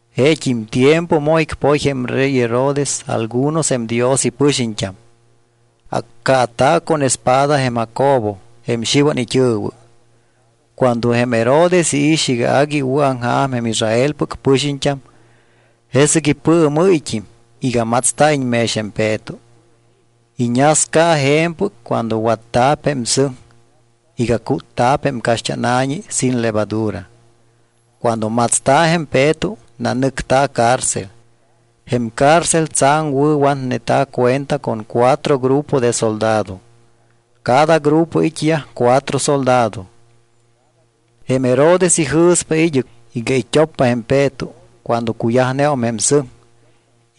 Jeet́im tiempo moj icpoy jém rey Herodes algunos jém Dios ipɨxiñt́am. Accaata̱ con espada jém Jacobo jém Xiwan it́ɨ̱wɨ. Cuando jém Herodes iix iga agui iwɨ̱aŋja̱m jém Israelpɨc pɨxiñt́am, jesɨc ipɨɨmɨ́yt́im iga matsta̱iñ mex jém Peto. Iñasca je̱mpɨc cuando watta̱p jém sɨŋ iga cútta̱p jém caxt́ána̱ñi sin levadura. Cuando matsta̱ jém Peto, nanɨcta̱ cárcel. Jém cárcel tsa̱m wɨ̱ watneta̱ cuenta con cuatro grupo de soldado. Cada grupo it́yaj cuatro soldado. Jém Herodes ijɨ̱spa id́ɨc iga it́oppa jém Peto cuando cuyajneum jém sɨŋ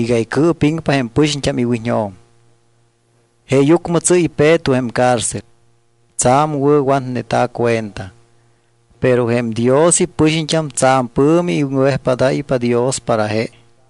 iga icɨɨpiŋpa jém pɨxiñt́am iwiñjo̱m. Jeeyucmɨ tsɨ́y Peto jém cárcel, tsa̱m wɨ̱watneta̱ cuenta. Pero jém Dios ipɨxiñt́am tsa̱m pɨ̱mi iŋwejpádáypa Dios para je.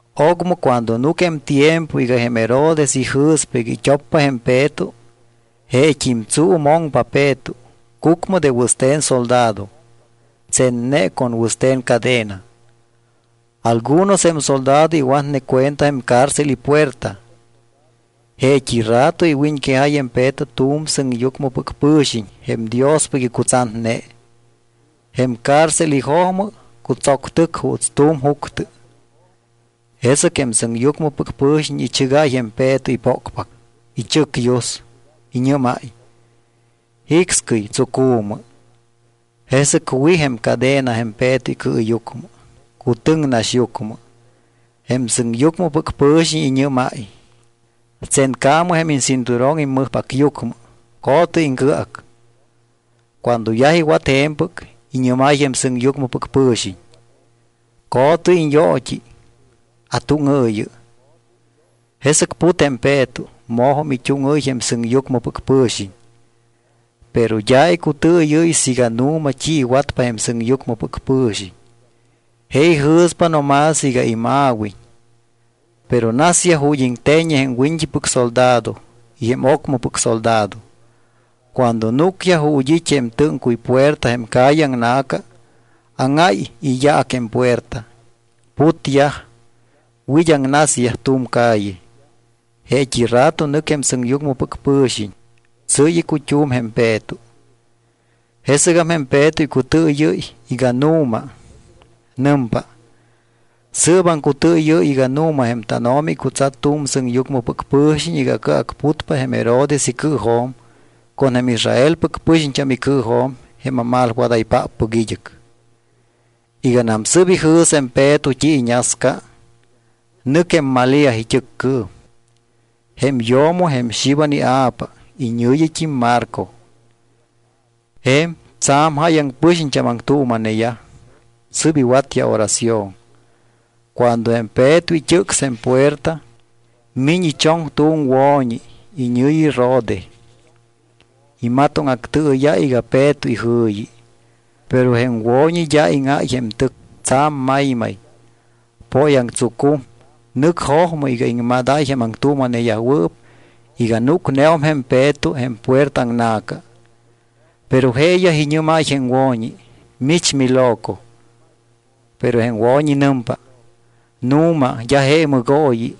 Ocmɨ cuando núc jém tiempo iga jém Herodes ijɨ̱spa iga it́oppa jém Peto, jeet́im tsuu moŋpa Peto cucmɨ de wɨste̱n soldado. Tsenne con wɨste̱n cadena. Algunos jém soldado iwatne cuenta jém cárcel ipuerta. Jeet́i rato iwiñquejáy jém Peto tu̱m sɨŋyucmɨpɨc pɨ̱xiñ jém Diospɨc icutsatne. Jém cárcel ijojmɨ cutsoctɨc juuts tu̱m juctɨ. Jesɨc jém sɨŋyucmɨpɨc pɨ̱xiñ ichɨgáy jém Peto ipócpac. Ichɨcyus. Iñɨ́máy: —Jicscɨy tsucu̱mɨ. Jesɨc wij jém cadena jém Peto icɨɨyucmɨ, cutɨŋ naxyucmɨ. Jém sɨŋyucmɨpɨc pɨ̱xiñ iñɨ́máy: —Tsencaamɨ jém iñcinturón immɨjpacyucmɨ. Co̱tɨ iŋcɨac. Cuando yaj iwat je̱mpɨc, iñɨ́máy jém sɨŋyucmɨpɨc pɨ̱xiñ: —Co̱tɨ iñyoot́i. Atúŋɨɨyɨ. Jesɨc put jém Peto, mojum it́úŋɨ́y jém sɨŋyucmɨpɨc pɨ̱xiñ. Pero d́a icutɨɨyɨ́y siiga nu̱ma t́i iwatpa jém sɨŋyucmɨpɨc pɨ̱xiñ. Je ijɨ̱spa no más iga ima̱wiñ. Pero nasyaj ju̱t́ iŋte̱ññe jém wiñt́ipɨc soldado y jém ocmɨpɨc soldado. Cuando núcyaj ju̱t́ it́ jém tɨ́ŋcuy puerta jém calle aŋna̱ca, áŋáy iyaac jém puerta. Putyaj, wid́aŋnasyaj tu̱m calle, jeet́i rato nɨc jém sɨŋyucmɨpɨc pɨ̱xiñ. Tsɨ́y icut́um jém Peto. Jesɨgam jém Peto icutɨɨyɨ́y iga nu̱ma. Nɨmpa: —Sɨɨp aŋcutɨɨyɨ́y iga nu̱ma jém tánO̱mi icutsat tu̱m sɨŋyucmɨpɨc pɨ̱xiñ iga acɨacputpa jém Herodes icɨɨjo̱m con jém Israelpɨc pɨxiñt́am icɨɨjo̱m jém amalwadaypáppɨc id́ɨc. Iganam sɨ́p ijɨ̱s jém Peto t́i iñasca, nɨc jém Malía it́ɨccɨɨm. Jém yo̱mo jém Xiwan ia̱pa iñɨ̱yit́im Marco. Je̱m tsa̱m jáyaŋ pɨxiñt́am aŋtuuma̱neyaj. Sɨ́p iwatyaj oración. Cuando jém Peto it́ɨcs jém puerta, miñ iŋtsoŋ tu̱m wo̱ñi iñɨ̱yi Rode. Imatóŋactɨɨyáy iga Peto ijɨ̱yi. Pero jém wo̱ñi d́a íŋáy jém tɨc. Tsa̱m maymay, póyaŋtsucum, nɨc jojmɨ iga iŋmadáy jém aŋtuuma̱neyajwɨɨp iga núcneum jém Peto jém puerta aŋna̱ca. Pero jeeyaj iñɨ́máy jém wo̱ñi: —Mich miloco. Pero jém wo̱ñi nɨmpa: —¡Nu̱ma, d́a je mɨgooyi!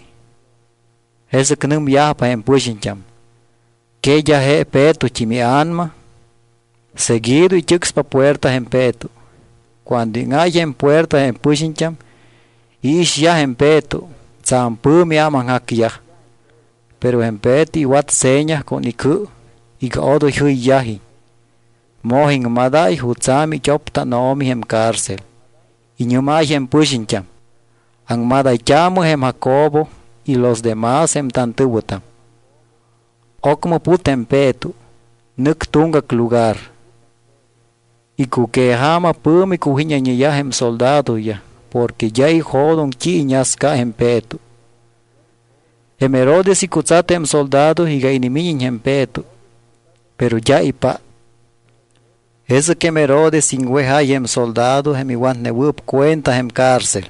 Jesɨc nɨmyajpa jém pɨxiñt́am: —¿Que d́a je Petot́im ia̱nama? Seguido it́ɨcspa puerta jém Peto. Cuando íŋáy jém puerta jém pɨxiñt́am, iixyaj jém Peto, tsa̱m pɨ̱mi ámaŋjacyaj. Pero jém Peto iwat seña con icɨ iga odoy jɨyyajiñ. Moj iŋmadáy jutsa̱ mit́op tánO̱mi jém cárcel. Iñɨ́máy jém pɨxiñt́am: —Aŋmadayt́aamɨ jém Jacobo y los demás jém tantɨ̱wɨtam. Ocmɨ put jém Peto, nɨc tuŋgac lugar. Icuqueja̱ma pɨ̱mi cujíñayñeyaj jém soldadoyaj porque d́a ijo̱doŋ t́i iñasca jém Peto. Jém Herodes icutsat jém soldado iga inimíñiñ jém Peto, pero d́a ipát. Jesɨc jém Herodes iŋwejáy jém soldado jém iwatneyajwɨɨp cuenta jém cárcel.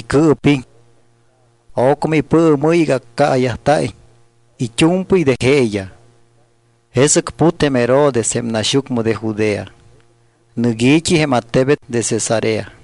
Icɨɨpiŋ. Ocmɨ ipɨɨmɨ́y iga accaayajta̱iñ it́u̱mpɨy de jeeyaj. Jesɨc put jém Herodes jém naxyucmɨ de Judea, nɨc i̱t́i jém attebet de Cesarea.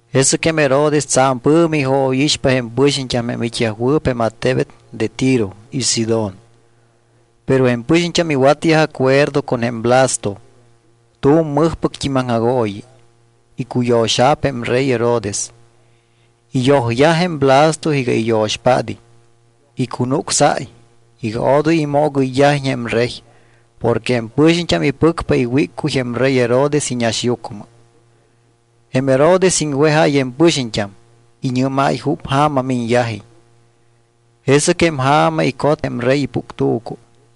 Jesɨc jém Herodes tsa̱m pɨ̱mi ijóyixpa jém pɨxiñt́am jém it́yajwɨɨp jém attebet de Tiro y Sidón. Pero jém pɨxiñt́am iwatyaj acuerdo con jém Blasto, tu̱m mɨjpɨct́im aŋjagooyi, icuyo̱xa̱p jém rey Herodes. Iyojyaj jém Blasto iga iyo̱xpád́iñ. Icunucsáy iga odoy imoogɨyyajiñ jém rey porque jém pɨxiñt́am ipɨcpa iwíccuy jém rey Herodes iñaxyucmɨ. Jém Herodes iŋwejáy jém pɨxiñt́am. Iñɨ́máy júp ja̱ma miñyajiñ. Jesɨc jém ja̱ma icot jém rey ipuctu̱cu.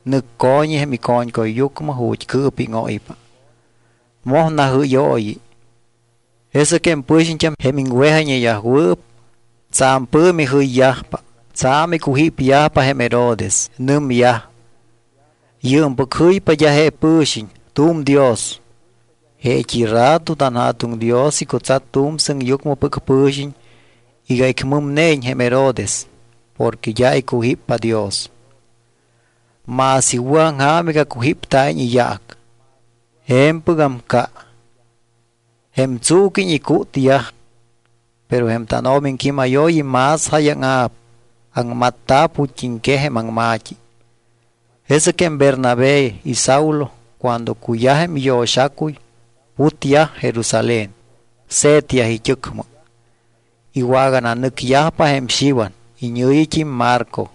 Nɨc co̱ñi jém ico̱ñcuyyucmɨ ju̱t́ cɨɨpíŋóypa. Moj najɨ́yooyi. Jesɨc jém pɨxiñt́am, jém iŋwejayñeyajwɨɨp, tsa̱m pɨ̱mi jɨyyajpa, tsa̱m icujípyajpa jém Herodes. Nɨmyaj: —Yɨɨmpɨc jɨypa d́a je pɨ̱xiñ, tu̱m dios. Jeet́i rato tanJa̱tuŋ Dios icutsat tu̱m sɨŋyucmɨpɨc pɨ̱xiñ iga icmɨmneiñ jém Herodes porque d́a icujíppa Dios. Más iwɨ̱aŋja̱m iga cujípta̱iñ iyaac. Je̱mpɨgam ca. Jém tsuuquiñ icútyaj. Pero jém tánO̱mi iŋquímayooyi más jáyaŋa̱p. Aŋmatta̱p ju̱t́iŋquej jém aŋma̱t́i. Jesɨc jém Bernabé y Saulo cuando cuyaj jém iyo̱xacuy, putyaj Jerusalén. Se̱tyaj it́ɨcmɨ. Iwagananɨcyajpa jém Xiwan iñɨ̱yit́im Marco.